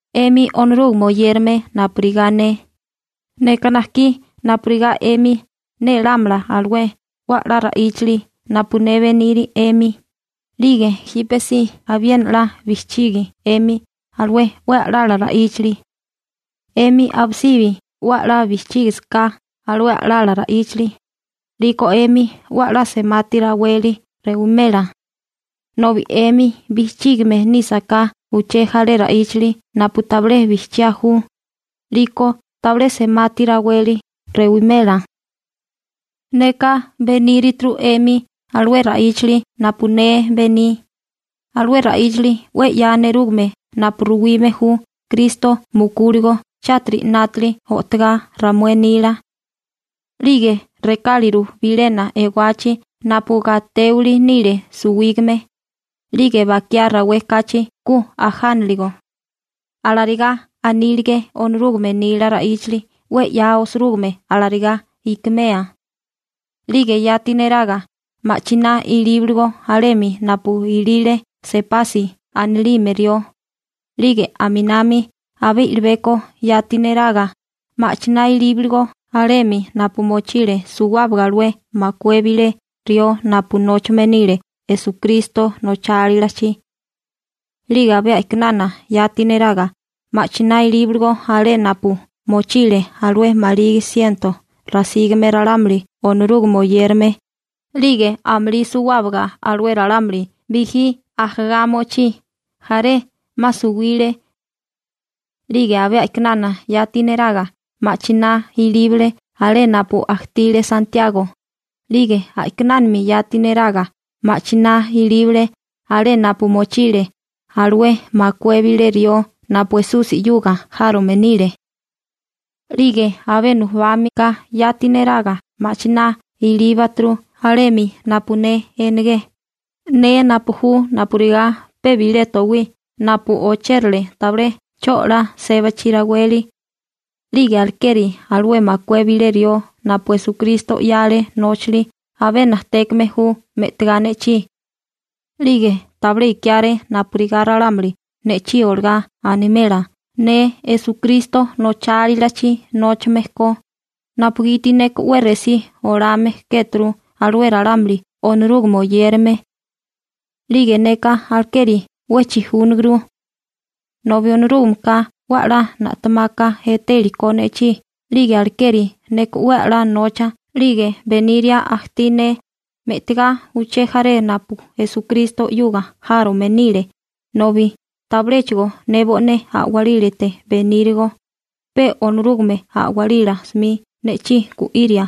'Emi Onorúgame oyérame napurigá ne, neka najkí napurigá 'emi nélámala alué 'we 'la ra'íchali napu ne beniri 'emi, 'lige jípesí abiena 'la bijchigi 'emi alué 'we a'lala ra'íchali. 'Emi abisibi 'we 'la bijchígisaká alué a'lala ra'íchali, 'liko 'emi 'we 'la semati raweli rewimela. Nobi 'emi bijchime nísaká uché jaré ra'íchali napu tabilé bijchiá ju, 'liko tabilé semati raweli rewimela. Neka benírituru 'emi alué ra'íchali napu ne bení, alué ra'íchali 'we 'ya nerúgame napu ruwime ju Kristo mukúligo chátiri 'nátali o'togá ramué nila. 'Lige rekáliru bilena ewachi napu gatéwili nile suwígame, 'lige bakiá rawé kachi ku ajániligo. Alarigá anílige Onorúgame nila ra'íchali 'we 'ya osirúgime alarigá ikimea. 'Lige yati neraga ma'chiná ilíbaligo alemi napu ilile Sepasi (Pegro) anilime rió, 'lige aminami abé i'libeko yati neraga ma'chiná ilíbaligo alemi napu mochile suwábaga alué makué bilé rió napu nóchame nile Esukristo nochálilachi. 'Lige abé a'kinana yati neraga ma'chiná ilíbaligo alé napu mochile alué maligi siento rasígame ralámuli Onorúgame oyérame, 'lige amulí suwábaga alué ralámuli bijí ajagá mochí. Jaré 'ma suwile. 'Lige abé a'kinana yati neraga ma'chiná ilíbale alé napu ajtile Santiago, 'lige a'kinánami yati neraga ma'chiná ilíbale alé napu mochile alué makué bilé rió napu Esusi 'yuga járome nile. 'Lige abé nujubami ka yati neraga ma'chiná ilíbaturu alemi napu ne enegé, ne napu ju napurigá pe bilé towí napu ochérale tabilé 'cho 'la sébachi raweli. 'Lige alekeri alué makué bilé rió napu Esukristo 'yale nóchali abé najtékame ju me'tigá ne'chí. 'Lige tabilé ikiáré napurigá ralámuli ne'chí olagá animela ne Esukristo nochálilachi nóchame ko, napugiti neka 'we resí olame kéturu alué ralámuli Onorúgame oyérame. 'Lige neka alekeri 'we chijúnaguru. Nobi Onorúgameka 'we 'la na'temaka etéliko ne'chí 'lige alekeri neka 'we 'la nocha 'lige beniria ajtí ne me'tigá uché jaré napu Esukristo 'yuga járome nile nobi tabiléchigo ne bo'né a'walílate benírigo, pe Onorúgame a'walila 'smi ne'chí gu'iria.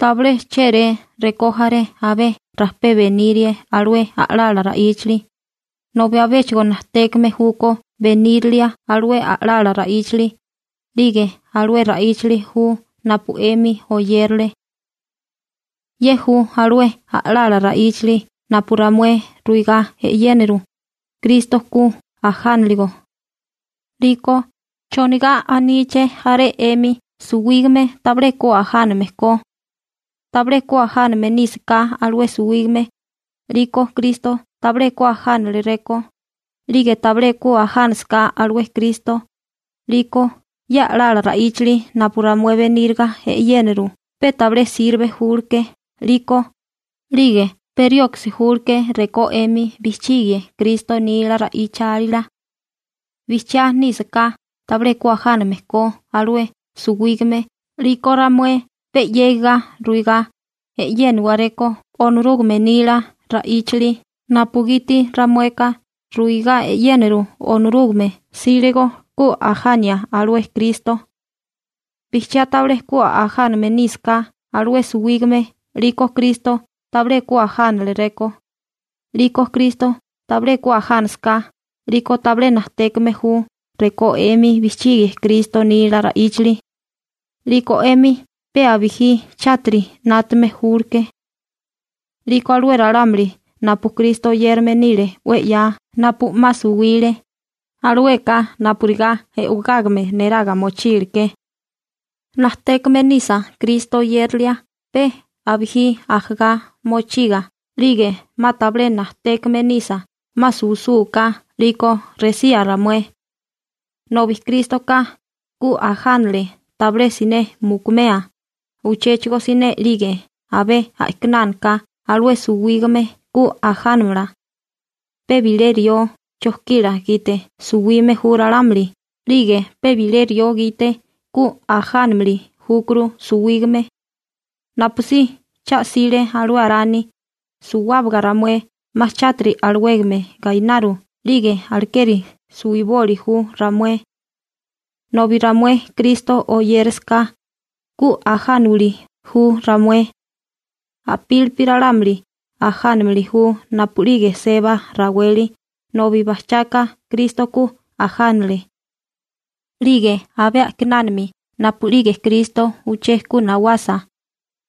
Tabilé chéré rekó jaré abé rajpé benirie alué a'lala ra'íchali, nobi abéchigo najtékame júkó benírilia alué a'lala ra'íchali, 'lige alué ra'íchali ju napu 'emi oyérale. Ye ju alué a'lala ra'íchali napu ramué ruigá e'yéniru: Kristo ku ajániligo. 'Liko ¿chonigá aníché jaré 'emi suwígame tabilé ku ajáname ko? Tabilé ku ajáname nísaká alué suwígame, 'liko Kristo tabilé ku ajánaleréko, 'lige tabilé ku ajánasaká alué Kristo, 'liko ye a'lala ra'íchali napu ramué beníriga e'yéniru pe tabilé sirbe júleké 'liko, 'lige pe rioksi julke rekó 'emi bijchigie Kristo nila ra'ichálila. Bijchiá nísaká tabilé ku ajáname ko alué suwígame 'liko ramué pe 'yégiga ruigá e'yéniwaréko Onorúgame nila ra'íchali napugiti ramueka ruigá e'yéniru Onorúgame 'sílego ku ajania alué Kristo. Bijchiá tabilé ku ajáname nísaká alué suwígame 'liko Kristo tabilé ku ajáneleréko, 'liko Kristo tabilé ku ajánasaká 'liko tabilé najtékame ju rekó 'emi bijchigie Kristo nila ra'íchali, 'liko 'emi pe abijí chátiri 'nátame júleké. 'Liko alué ralámuli napu Kristo oyérame nile 'we 'ya napu 'ma suwile, alueka napurigá e'wagágame neraga mochíliké. Najtékame nisa Kristo oyérilia pe abijí ajagá mochiga 'lige 'ma tabilé najtékame nisa 'ma suwisúká, 'liko resía ramué. Nobi Krístoka ku ajánale tabilé siné mukumea uchéchigo siné 'lige abé a'kinánaka alué suwígame ku ajánamala. Pe bilé rió (Arani) chojkila gite suwime ju ralámuli 'lige pe bilé rió gite (Kristo) ku ajánimili júkuru suwígame. Napusí cha'sile alué Arani, suwábaga ramué 'ma chátiri alawégame gainaru 'lige alekeri suwiboli ju ramué. Nobi ramué Kristo oyérisiká, ku ajániwili ju ramué. A'pílipi ralámuli ajánimili ju napu'lige seba raweli nobi bajchaka Kristo ku ajánale. 'Lige abé a'kinánami napu'lige Kristo uché ku nawasa,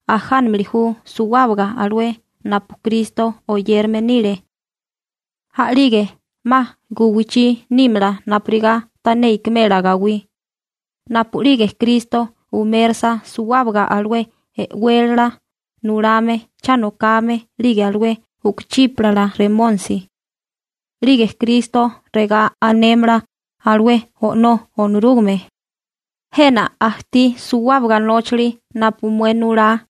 ajánamili ju suwábaga alué napu Kristo oyérame nile. A'lige 'ma guwichí nímala napurigá tané ikimela gawí, napu'lige Kristo umérasa suwábaga alué e'wélala nulame cha nokame 'lige alué u'kuchípala remónisi. 'Lige Kristo regá anémala alué O'nó Onorúgame: «Jena ajtí suwábaga nóchali napu mué nulá.»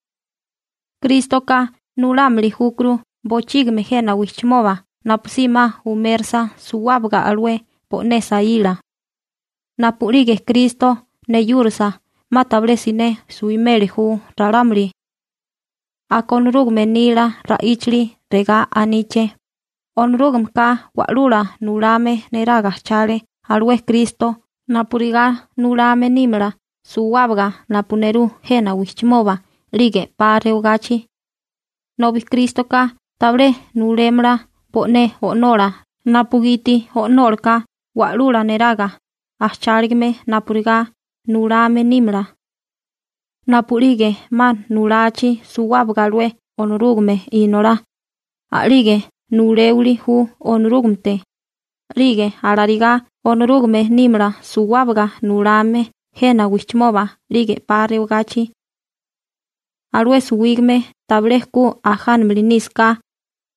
Krístoka nulámili júkuru bochígimi jena wijchimoba napusí 'ma umérisa suwábaga alué bo'né saíla. Napu'lige Kristo neyúrasa, 'ma tabilé siné suwimeli ju ralámuli. Aka Onorúgame nila ra'íchali regá aníché: «Onorúgameka wa'lula nulame neraga ajchale alué Kristo napurigá nulame nímala suwábaga napu nerú jena wijchimoba 'lige 'pa rewagachi», nobi Krístoka tabilé nulémala bo'né O'nola napugiti O'nólaka wa'lula neraga ajcháligame napurigá nulame nímala. Napu'lige 'ma nulachi suwábaga alué Onorúgame Inolá, a'lige nuléwili ju Onorúgamete, 'lige alarigá Onorúgame nímala suwábaga nulame jena wijchimoba 'lige 'pa rewagachi. Alué suwígame tabilé ku ajánimili nísaká,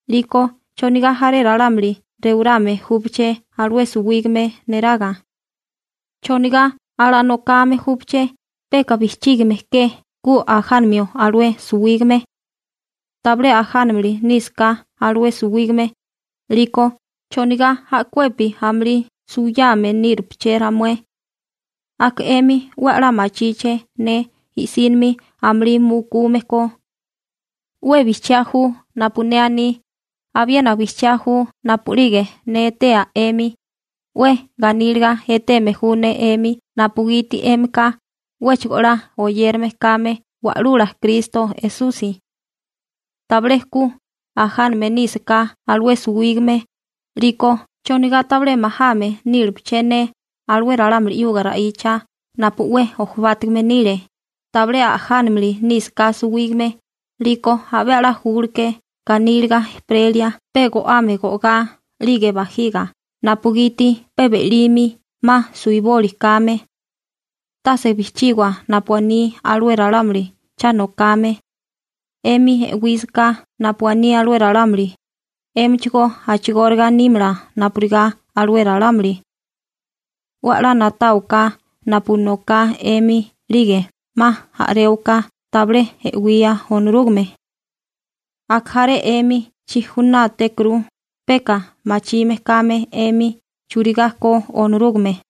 'liko ¿chonigá jaré ralámuli rewarame júpaché alué suwígame neraga? ¿Chonigá alanokame júpaché peka bijchígime ke ku ajánamio alué suwígame? Tabilé ajánamili nísaká alué suwígame, 'liko ¿chonigá a'kuepi amulí suwiyame nírupaché ramué? Aka 'emi 'we 'la machíché ne i'sínimi amulí mukume ko. 'We bijchiá ju napu ne aní, abiena bijchiá ju napu'lige ne etea 'emi, 'we ganíliga eteme ju ne 'emi napugiti 'émika 'wéchigo 'la oyérame kame Wa'lula Kristo Esusi. Tabilé ku ajáname nísaká alué suwígame, 'liko ¿chonigá tabilé majame nílepaché ne alué ralámuli 'yuga ra'icha napu 'we jobátigame nile? Tabilé ajánamili nísaká suwígame 'liko abé 'la júleké ganíliga ejperelia pe go'ame go'gá 'lige bajiga napugiti pe be'limi 'ma suwiboli kame. Tase bijchígiwa napu aní alué ralámuli cha nokame. 'Emi e'wísaká napu aní alué ralámuli, 'émichigó a'chigóriga nímala napurigá alué ralámuli. 'We 'la na'táwaká napu noká 'emi 'lige 'ma a'réwaká tabilé e'wía Onorúgame. Aka jaré 'emi chijunátékuru peka machime kame 'emi churigá ko Onorúgame.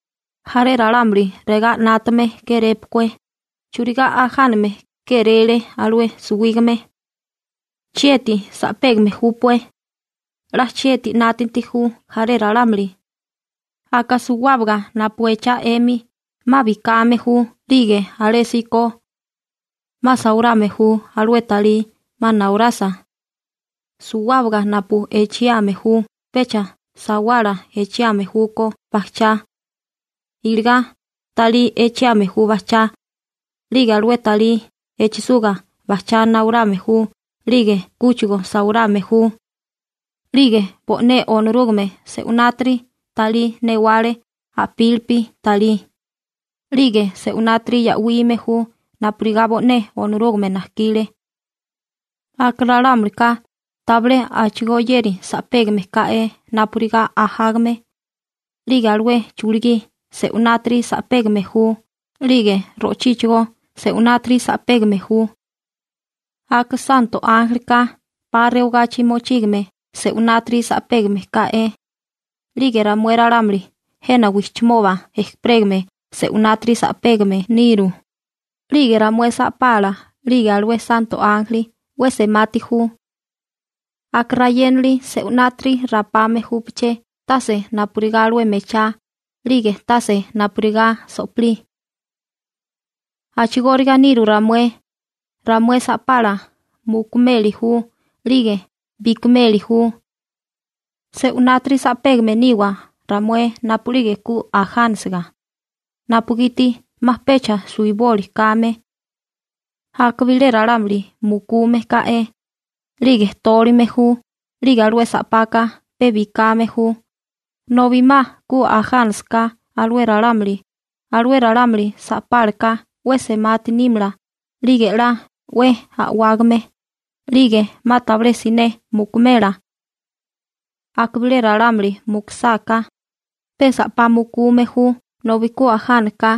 Jaré ralámuli regá 'nátame kérépukué: «¿Churigá ajáname kéréle alué suwígame? ¿Chieti sa'pégame júpué?» 'La chieti 'nátanti ju jaré ralámuli. Aka suwábaga napu echá 'emi 'ma bikame ju 'lige alésíko 'ma sawarame ju alué talí 'ma nawarasa. Suwábaga napu echiame ju pecha sawala echiame júkó bajchá, iligá talí echiame ju bajchá, 'lige alué talí echisuga bajchá nawarame ju 'lige kúchigo sawarame ju. 'Lige bo'né Onorúgame se'unátiri talí newale a'pílipi talí, 'lige se'unátiri ya'wime ju napurigá bo'né Onorúgame najkile. Aka ralámulika tabilé a'chigóyéri sa'pégame ká'é napurigá ajágame, 'lige alué chulugí se'unátiri sa'pégame ju 'lige ro'chíchigó se'unátiri sa'pégame ju. Aka santo ánjelika 'pa rewagachi mochígame se'unátiri sa'pégame ká'é, 'lige ramué ralámuli jena wijchimoba ejperégame se'unátiri sa'pégame niru, 'lige ramué sa'pala 'lige alué santo ánjeli 'we semati ju. Aka rayénali se'unátiri rapame júpaché tase napurigá alué mechá 'lige tase napurigá so'pilí. A'chigóriga niru ramué, ramué sa'pala mukumeli ju 'lige bikimeli ju. Se'winátiri sa'pégame niwa ramué napu'lige ku ajánisiga, napugiti 'ma pecha suwiboli kame. Aka bilé ralámuli mukume ka'e, 'lige tólime ju, 'lige alué sa'paka pe bikame ju, nobi 'ma ku ajánasaká alué ralámuli, alué ralámuli sa'pálaka 'we semati nímala 'lige 'la 'we a'wágame, 'lige 'ma tabilé siné mukumela. Aka bilé ralámuli mukusáká, pe sa'pá mukume ju nobi ku ajánaka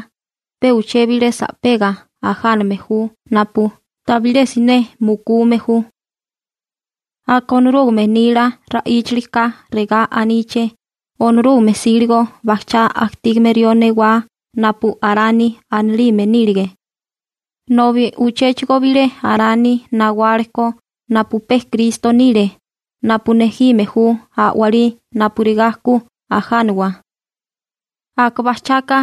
pe uché bilé sa'pega ajáname ju napu tabilé siné mukume ju. Aka Onorúgame nila ra'íchilika regá aníché Onorúgame 'sílego bajchá ajtígame rió newá napu Arani anilime nílige, nobi uchéchigo bilé Arani nawálekó napu pe Kristo nile napu nejime ju a'walí napurigá ku ajániwa. Aka bajchaka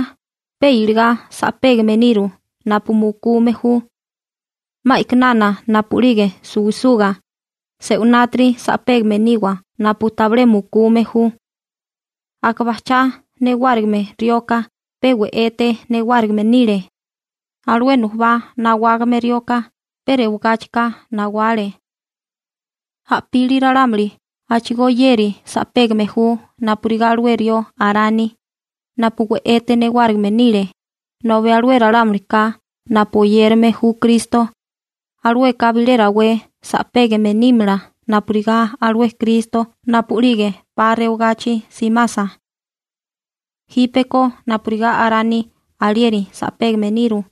pe iligá sa'pégame niru napu mukume ju. 'Ma a'kinana napu'lige suwisuga, se'unátiri sa'pégame niwa napu tabilé mukume ju. Aka bajchá newárigime rioka pe we'ete newárigime nile. Alué nujubá nawágame rioka pe rewagáchika nawale. A'pili ralámuli a'chigóyéri sa'pégame ju napurigá alué rió Arani, napu we'ete newárigime nile, nobi alué ralámulika napu oyérame ju Kristo, alueka bilé rawé sa'pégame nímala napurigá alué Kristo napu'lige 'pa rewagachi simasa. Jípeko napurigá Arani alieri sa'pégame niru,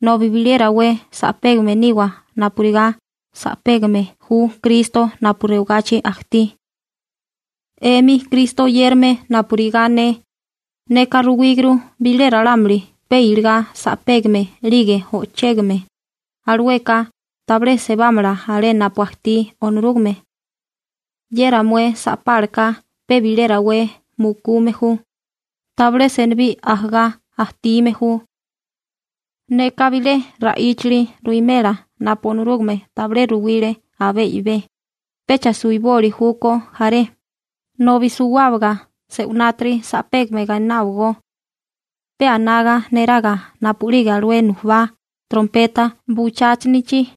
nobi bilé rawé sa'pégame niwa napurigá sa'pégame ju Kristo napu rewagachi ajtí. 'Emi Kristo oyérame napurigá ne, neka ruwíguru bilé ralámuli pe iligá sa'pégame 'lige o'chégame, alueka tabilé sebámala alé napu ajtí Onorúgame. Ye ramué sa'pálaka pe bilé rawé mukume ju, tabilé senibí ajagá ajtígame ju. Neka bilé ra'íchali ruwimela napu Onorúgame tabilé ruwile abé i'bé: Pecha suiboli júkó jaré, nobi suwábaga se'winátiri sa'pégame gaináwagó. Pe anaga neraga napu'lige alué nujubá trompeta bucháchinichi,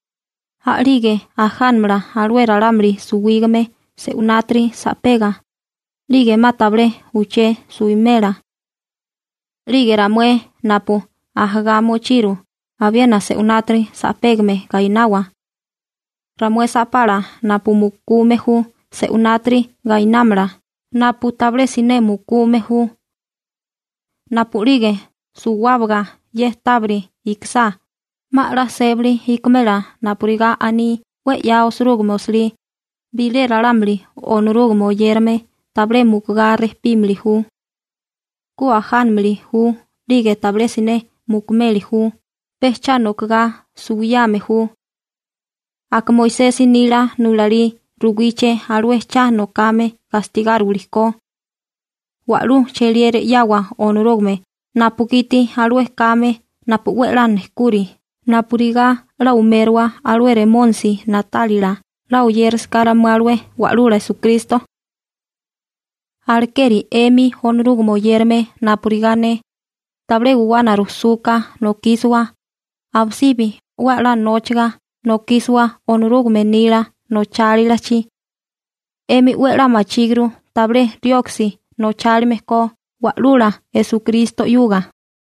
a'lige ajánamala alué ralámuli suwígame se'unátiri sa'pega, 'lige 'ma tabilé uché suimela. 'Lige ramué napu ajagá mochiru abiena se'unátiri sa'pégame gainawa. Ramué sa'pala napu mukume ju se'unátiri gainámala, napu tabilé siné mukume ju. Napu'lige suwábaga ye tábiri ikisá, 'ma 'la sébali ikimela napurigá aní 'we 'ya osirúgime osilí: «Bilé ralámuli Onorúgame oyérame tabilé mukugá rejpímili ju.» «Ku ajánimili ju 'lige tabilé siné mukumeli ju.» Pe cha nokigá suwiyame ju. Aka Moisesi nila nulalí ruwíché alué cha nokame gastigáriwili ko. ¡Wa'lú cheliera 'yawa Onorúgame napugiti alué kame napu 'we 'la nejkuri napurigá 'la umérowa alué Remónisi na'tálila 'la oyérisiká ramué alué Wa'lula Esukristo! Alekeri 'emi Onorúgame oyérame napurigá ne, tabilé guwana rujsuka nokísiwa, abisibi 'we 'la nóchaga nokísiwa Onorúgame nila nochálilachi. 'Emi 'we 'la machíguru tabilé rioksi nochálime ko Wa'lula Esukristo 'yuga.